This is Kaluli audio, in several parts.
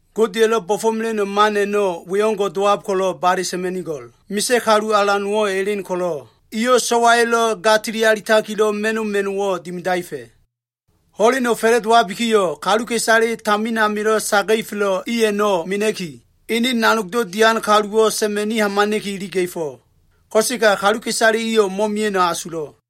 “Godeya꞉lo꞉ bo꞉fo꞉mela꞉no꞉ man a꞉no꞉, we o꞉ngo꞉ dowab ko꞉lo꞉ bale sa꞉ma꞉nigo꞉l. Misa꞉ kalu alan nowo꞉ elen ko꞉lo꞉, eyo꞉ so꞉waya꞉lo꞉ ga tilili alitakilo꞉ ma꞉no꞉ ma꞉no꞉wo꞉ dimidaefa꞉. Ho꞉leno꞉ fa꞉la꞉dowabikiyo꞉, kaluka꞉isale tamin amilo꞉ saga꞉ifelo꞉ i a꞉no꞉ mena꞉ki, ene nanogdo꞉ dian kaluwo꞉ sa꞉ma꞉ni hamana꞉ki iliga꞉fo꞉. Ko꞉sega kaluka꞉isale iyo꞉ mo꞉mia꞉no꞉ asulo꞉.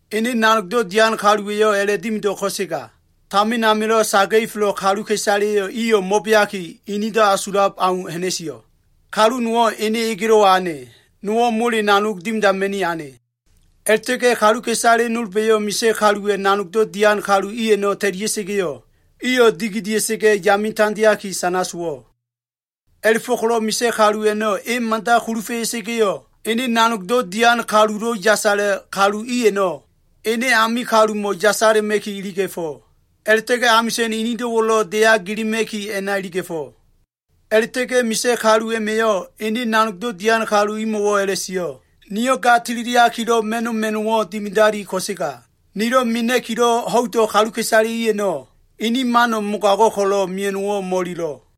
Ene nanogdo꞉ dian kaluwa꞉yo꞉ a꞉la꞉dimido꞉ ko꞉sega tamin amilo꞉ saga꞉ifelo꞉ kaluka꞉isale iyo꞉ mo꞉beaki, inido꞉ asulab au ha꞉na꞉sio꞉. Kalu nowo꞉ ene egelo꞉wa ane, nowo꞉ mole nanog dimidama꞉ni ane. A꞉la꞉ta꞉ga꞉ kaluka꞉isale nolba꞉yo꞉ misa꞉ kaluwa꞉ nanogdo꞉ dian kalu i a꞉no꞉ ta꞉lia꞉sa꞉ga꞉yo꞉, iyo꞉ dikidia꞉sa꞉ga꞉ yame tandeaki, sana sowo꞉. A꞉la꞉fo꞉ko꞉lo꞉ misa꞉ kalu a꞉no꞉ e mada kulufa꞉ya꞉sa꞉ga꞉yo꞉, ene nanogdo꞉ dian kalulo꞉ yasala꞉ kalu i a꞉no꞉, ene ame kalumo꞉ yasala꞉ma꞉ki iliga꞉fo꞉. A꞉la꞉ta꞉ga꞉ amisa꞉n inido꞉wo꞉lo꞉ deya gilima꞉ki a꞉na iliga꞉fo꞉. A꞉la꞉ta꞉ga꞉ misa꞉ kalu a꞉ma꞉yo꞉ ene nanogdo꞉ dian kalu imo꞉wo꞉ a꞉la꞉sio꞉, ‘Niyo꞉ ga tililiakilo꞉ ma꞉no꞉ ma꞉no꞉wo꞉ dimidali, ko꞉sega nilo꞉ mena꞉kilo꞉ ho꞉ido꞉ kaluka꞉isale i a꞉no꞉, ini mano꞉ mogago꞉ ko꞉lo꞉ mea꞉no꞉wo꞉ mo꞉ililo꞉.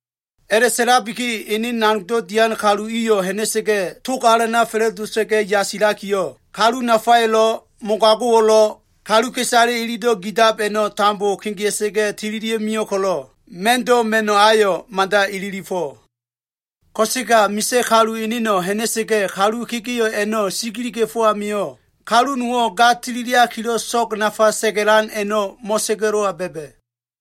A꞉la꞉sa꞉labiki ene nanogdo꞉ dian kalu iyo꞉ ha꞉na꞉sa꞉ga꞉, tog alana fa꞉la꞉dota꞉ga꞉ yasilakiyo꞉, kalu nafayo꞉lo꞉ mogago꞉wo꞉lo꞉, kaluka꞉isale ilido꞉ gidab a꞉no꞉ tambo kegea꞉sa꞉ga꞉ tililia꞉ mio꞉ ko꞉lo꞉, ma꞉ndo꞉ ma꞉no꞉ ayo꞉ mada ililifo꞉. “Ko꞉sega misa꞉ kalu eneno꞉ ha꞉na꞉sa꞉ga꞉ kalu kegeo꞉ a꞉no꞉ sigiliga꞉fo꞉ amio꞉, kalu nowo꞉ ga tililiakilo꞉ so꞉g nafale sa꞉ga꞉lan a꞉no꞉ mo꞉sa꞉ga꞉lo꞉wa ba꞉ba꞉.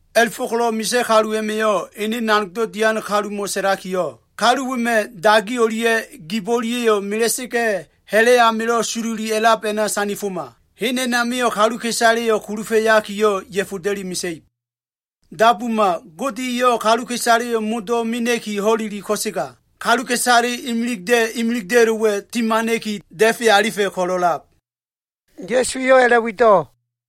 A꞉la꞉fo꞉ko꞉lo꞉ misa꞉ kalu a꞉ma꞉yo꞉ ene nanogdo꞉ dian kalumo꞉ sa꞉lakiyo꞉, ‘Kalu wema꞉ dagi o꞉lia꞉ gib o꞉lia꞉yo꞉ mela꞉sa꞉ga꞉, ha꞉la꞉ amilo꞉ sololi a꞉lab a꞉na sandifoma. Hen a꞉namio꞉ kaluka꞉isaleyo꞉ kulufa꞉yakiyo꞉, ya꞉foda꞉li mesa꞉ib.’ Dabuma, Gode eyo꞉ kaluka꞉isaleyo꞉ modo꞉ mena꞉ki ho꞉leli ko꞉sega, kaluka꞉isale imilida꞉ imilida꞉lo꞉wa꞉ timana꞉ki da꞉fe alifa꞉ ko꞉lo꞉lab.” Ya꞉su eyo꞉ a꞉la꞉wido꞉.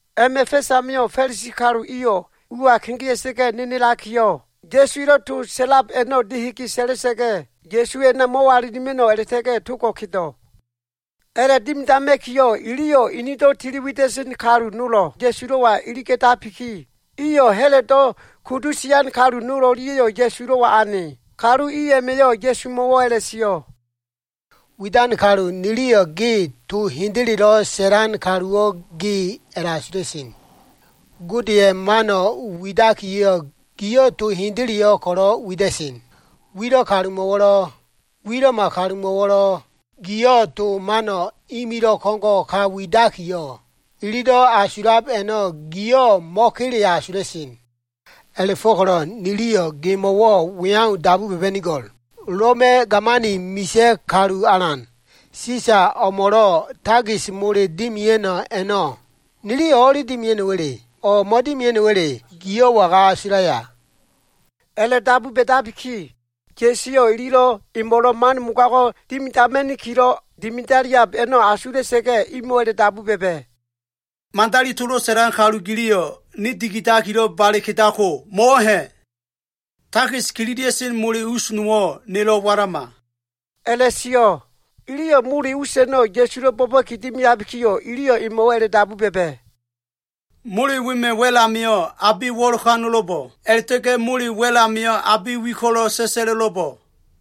A꞉ma꞉ fa꞉s amio꞉, Fa꞉lisi kalu iyo꞉ ua kegea꞉sa꞉ga꞉ nenelakiyo꞉, Ya꞉su elo꞉ to sa꞉lab a꞉no꞉ dehege sa꞉la꞉sa꞉ga꞉ Ya꞉suwo꞉ a꞉na mo꞉walilima꞉no꞉ a꞉la꞉ta꞉ga꞉ togo꞉ kedo꞉. A꞉la꞉dimidama꞉kiyo꞉ iliyo꞉ inido꞉ tili wida꞉sen kalu nolo꞉ Ya꞉sulo꞉wa iliga꞉tabiki, iyo꞉ Ha꞉lodo꞉ kudu sian kalu nol o꞉lia꞉yo꞉ Ya꞉sulo꞉wa ane. Kalu i a꞉ma꞉yo꞉ Ya꞉sumo꞉wo꞉ a꞉la꞉sio꞉, “Widan kalu, niliyo꞉ ge to hendelelo꞉ sa꞉lan kaluwo꞉ ge a꞉la꞉asula꞉sen. Godeya꞉ mano꞉ widakiyo꞉, giyo꞉ to hendeleyo꞉ ko꞉lo꞉ wida꞉sen. Wilo꞉ kalumo꞉wo꞉lo꞉, wilo꞉ma kalumo꞉wo꞉lo꞉, giyo꞉ to mano꞉ imilo꞉ ko꞉ngo꞉ ka widakiyo꞉, ililo꞉ asulab a꞉no꞉ giyo꞉ mo꞉kele asula꞉sen. A꞉la꞉fo꞉ko꞉lo꞉ niliyo꞉ gemo꞉wo꞉ we au dabu ba꞉ba꞉nigo꞉l. Loma꞉ gamani misa꞉ kalu alan, Sisa o꞉mo꞉lo꞉ takis mole dimia꞉no꞉ a꞉no꞉ niliyo꞉ o꞉li dimia꞉no꞉wa꞉le? O꞉ mo꞉dimia꞉no꞉wa꞉le, giyo꞉ waga asulaya?” A꞉la꞉dabu ba꞉dabiki, Ya꞉su eyo꞉ ililo꞉ emo꞉lo꞉ man mogago꞉ dimidama꞉nikilo꞉ dimidaliab a꞉no꞉ asula꞉sa꞉ga꞉, imo꞉wo꞉ a꞉la꞉dabu ba꞉ba꞉, “To mosowa꞉lo꞉ widan kalu giliyo꞉, ne dikidakilo꞉ bale kedako, mo꞉wo꞉ ha꞉? Takis kililia꞉sen mole us nowo꞉ nelo꞉ walama,” a꞉la꞉sio꞉. Iliyo꞉ mole us a꞉no꞉ Ya꞉sulo꞉ bo꞉ba꞉ki dimiabikiyo꞉, eyo꞉ imo꞉wo꞉ a꞉la꞉dabu ba꞉ba꞉, “Mole wema꞉ wa꞉l amio꞉ abe wo꞉lokano꞉lo꞉bo꞉? A꞉la꞉ta꞉ga꞉ mole wa꞉l amio꞉ abe wi ko꞉lo꞉ sa꞉sa꞉lo꞉lo꞉bo꞉?”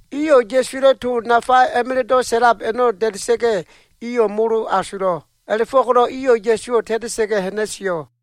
Iyo꞉ Ya꞉suwa꞉lo꞉ to nafa a꞉ma꞉la꞉do꞉ sa꞉lab a꞉no꞉ da꞉da꞉sa꞉ga꞉, iyo꞉ molo asulo꞉. A꞉la꞉fo꞉ko꞉lo꞉ iyo꞉ Ya꞉suwo꞉ ta꞉ta꞉sa꞉ga꞉ ha꞉na꞉sio꞉.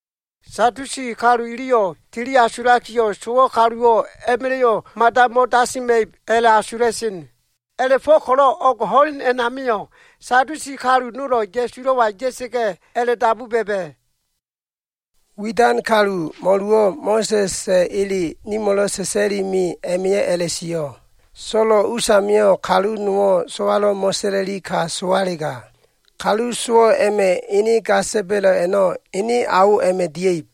Sadusi kalu iliyo꞉ tili asulakiyo꞉, sowo꞉ kaluwo꞉ a꞉ma꞉la꞉yo꞉ mada mo꞉dasima꞉ib a꞉la꞉asula꞉sen. A꞉la꞉fo꞉ko꞉lo꞉ o꞉g ho꞉lende a꞉namio꞉ Sadusi kalu nolo꞉ Ya꞉sulo꞉wa ya꞉sa꞉ga꞉ a꞉la꞉dabu ba꞉ba꞉, “Widan kalu, mo꞉luwo꞉ Mo꞉sa꞉sa꞉ ele nimo꞉lo꞉ sa꞉sa꞉li me a꞉ma꞉yo꞉ a꞉la꞉sio꞉, So꞉lo꞉ usamio꞉ kalu nowo꞉ so꞉walo꞉ mo꞉sa꞉la꞉li ka sowalega, kalu sowo꞉ a꞉ma꞉ ga sa꞉ba꞉lo꞉ a꞉no꞉, ene ao a꞉ma꞉ dia꞉ib.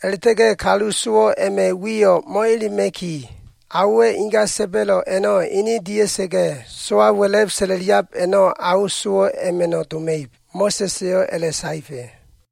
A꞉la꞉ta꞉ga꞉ kalu sowo꞉ a꞉ma꞉ wiyo꞉ mo꞉elema꞉ki, aowa꞉ inga sa꞉ba꞉lo꞉ a꞉no꞉ ene dia꞉sa꞉ga꞉ so꞉wa wa꞉la꞉b sa꞉la꞉liab a꞉no꞉, ao sowo꞉ a꞉ma꞉no꞉ doma꞉ib. Mo꞉sa꞉s eyo꞉ a꞉la꞉saefa꞉.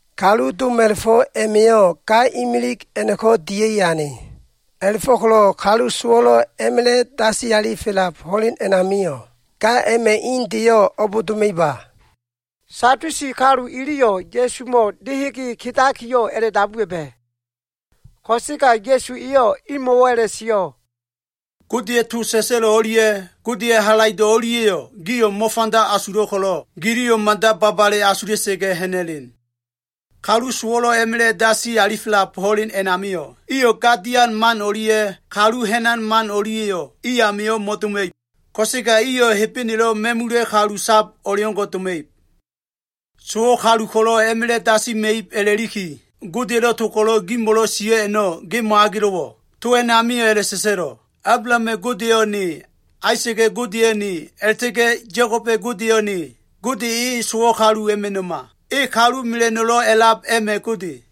Kalu doma꞉la꞉fo꞉ a꞉ma꞉yo꞉ ga imilig a꞉no꞉ko꞉ dia꞉i ane. A꞉la꞉fo꞉ko꞉lo꞉ kalu sowo꞉lo꞉ a꞉ma꞉la꞉ dasi alifelab ho꞉len a꞉namio꞉, ga a꞉ma꞉ indeyo꞉ o꞉b doma꞉iba?” Sadusi kalu iliyo꞉ Ya꞉sumo꞉ dehege kedakiyo꞉ a꞉la꞉dabu ba꞉ba꞉. Ko꞉sega Ya꞉su eyo꞉ imo꞉wo꞉ a꞉la꞉sio꞉, “Godeya꞉ to sa꞉sa꞉lo꞉ o꞉lia꞉, Godeya꞉ halaido꞉ o꞉lia꞉yo꞉ gio꞉ mo꞉fanda asulo꞉ ko꞉lo꞉, giliyo꞉ mada babale asula꞉sa꞉ga꞉ ha꞉na꞉len. Kalu sowo꞉lo꞉ a꞉ma꞉la꞉ dasi alifelab ho꞉len a꞉namio꞉, iyo꞉ ga dian man o꞉lia꞉ kalu ha꞉nan man a꞉no꞉lia꞉yo꞉ i amio꞉ mo꞉doma꞉ib. Ko꞉sega iyo꞉ Hebenelo꞉ ma꞉mula꞉ kalu sab o꞉leo꞉ngo꞉ doma꞉ib. Sowo꞉ kalu ko꞉lo꞉ a꞉ma꞉la꞉ dasima꞉ib a꞉la꞉liki, Godeya꞉lo꞉ to ko꞉lo꞉ gimo꞉lo꞉ sio꞉ a꞉no꞉, ge mo꞉agelo꞉wo꞉? To a꞉namio꞉ a꞉la꞉sa꞉sa꞉lo꞉, ‘Ablahama꞉ Godeyo꞉ Ne, Aisa꞉ga꞉ Godeyo꞉ Ne, a꞉la꞉ta꞉ga꞉ Ya꞉koba꞉ Godeyo꞉ Ne.’ Gode e sowo꞉ kalu a꞉ma꞉no꞉ma. E kalu mela꞉no꞉lo꞉ a꞉lab a꞉ma꞉ Gode.”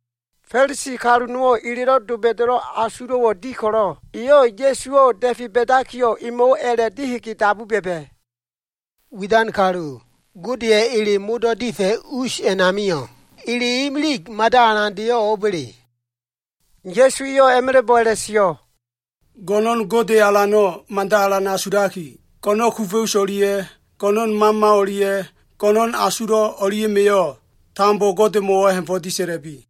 Fa꞉lisi kalu nowo꞉ elelo꞉ doba꞉da꞉yo꞉ asulo꞉wo꞉ di ko꞉lo꞉, eyo꞉ Ya꞉suwo꞉ da꞉fe ba꞉dakiyo꞉, emo꞉wo꞉ a꞉la꞉ dehege dabu ba꞉ba꞉, “Widan kalu, Godeya꞉ ele modo꞉ difa꞉ us a꞉namio꞉, ele imilig mada alandeyo꞉ o꞉ba꞉le?” Ya꞉su eyo꞉ a꞉ma꞉la꞉bo꞉ a꞉la꞉sio꞉, “Go꞉no꞉n Gode Alano꞉ mada alan asulaki, go꞉no꞉n kufa꞉ us o꞉lia꞉, go꞉no꞉n mama o꞉lia꞉, go꞉no꞉n asulo꞉ o꞉lia꞉ma꞉yo꞉ tambo Godemo꞉wo꞉ ha꞉fo꞉ disa꞉la꞉bi.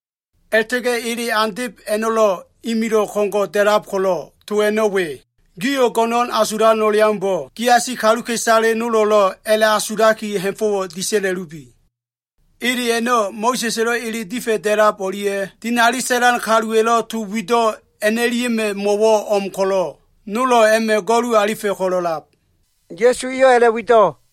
A꞉la꞉ta꞉ga꞉ ele andeb a꞉no꞉lo꞉ imilo꞉ ko꞉ngo꞉ da꞉lab ko꞉lo꞉ to a꞉no꞉ we, Gio꞉ go꞉no꞉n asulan o꞉leaumbo꞉, giasi kaluka꞉isale nolo꞉lo꞉ a꞉la꞉asulaki ha꞉fo꞉wo꞉ disa꞉la꞉lubi. Ele a꞉la꞉ a꞉no꞉, Mo꞉sa꞉sa꞉lo꞉ ele difa꞉ da꞉lab o꞉lia꞉ dinali sa꞉lan kaluwa꞉lo꞉ to wido꞉ a꞉no꞉lia꞉ma꞉ mo꞉wo꞉ o꞉m ko꞉lo꞉, nolo꞉ a꞉ma꞉ go꞉lu alifa꞉ ko꞉lo꞉lab.” Ya꞉su eyo꞉ a꞉la꞉wido꞉.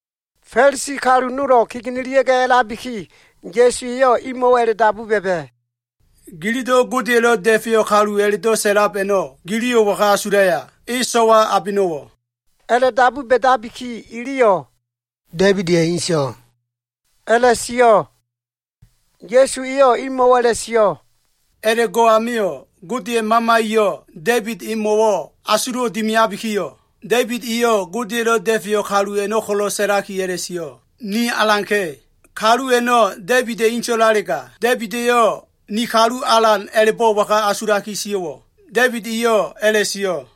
Fa꞉lisi kalu nolo꞉ kegenelia꞉ga꞉ a꞉labiki, Ya꞉su eyo꞉ imo꞉wo꞉ a꞉la꞉dabu ba꞉ba꞉, “Gililo꞉ Godeya꞉lo꞉ da꞉feyo꞉ kalu a꞉la꞉do꞉ sa꞉lab a꞉no꞉, giliyo꞉ waga asulaya? E so꞉wa abeno꞉wo꞉?” A꞉la꞉dabu ba꞉dabiki, iliyo꞉, “Da꞉ibida꞉ inso꞉” a꞉la꞉sio꞉. Ya꞉su eyo꞉ imo꞉wo꞉ a꞉la꞉sio꞉, “A꞉la꞉go꞉ amio꞉, Godeya꞉ Mama eyo꞉ Da꞉ibid emo꞉ asulo꞉wo꞉ dimiabikiyo꞉, Da꞉ibid eyo꞉ Godeya꞉lo꞉ da꞉feyo꞉ kalu a꞉no꞉ ko꞉lo꞉ sa꞉laki a꞉la꞉sio꞉, ‘Ni Alanka꞉.’ Kalu a꞉no꞉ Da꞉ibida꞉ inso꞉lalega, Da꞉ibid eyo꞉ ‘ni Kalu Alan’ a꞉la꞉bo꞉ waga asulaki sio꞉wo꞉? Da꞉ibid eyo꞉ a꞉la꞉sio꞉,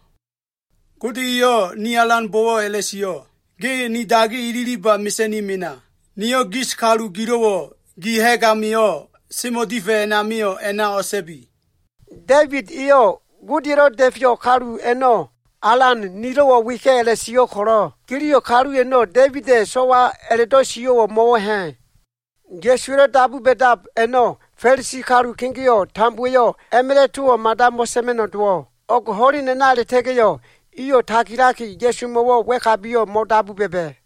“ ‘Gode eyo꞉ ni Alanbo꞉wo꞉ a꞉la꞉sio꞉, “Ge ni dagi ililiba mesa꞉ni mena. Niyo꞉ gis kalu gilo꞉wo꞉ gi ha꞉g amio꞉ semo꞉ difa꞉ amio꞉, a꞉na o꞉sa꞉bi.” ’ Da꞉ibid eyo꞉ Godeya꞉lo꞉ Da꞉feyo꞉ kalu a꞉no꞉, ‘Alan nilo꞉wo꞉ weka꞉’ a꞉la꞉sio꞉ ko꞉lo꞉, giliyo꞉ kalu a꞉no꞉ Da꞉ibida꞉ inso꞉ a꞉la꞉do꞉ sio꞉wo꞉ mo꞉wo꞉ ha꞉?” Ya꞉suwa꞉lo꞉ dabu ba꞉dab a꞉no꞉, Fa꞉lisi kalu kegeo꞉ tambowa꞉yo꞉ a꞉ma꞉la꞉ towo꞉ mada mo꞉sa꞉ma꞉no꞉ dowo꞉. O꞉g ho꞉len a꞉na a꞉la꞉ta꞉ga꞉yo꞉, iyo꞉ tagilaki Ya꞉sumo꞉wo꞉ wa꞉kabiyo꞉ mo꞉dabu ba꞉ba꞉.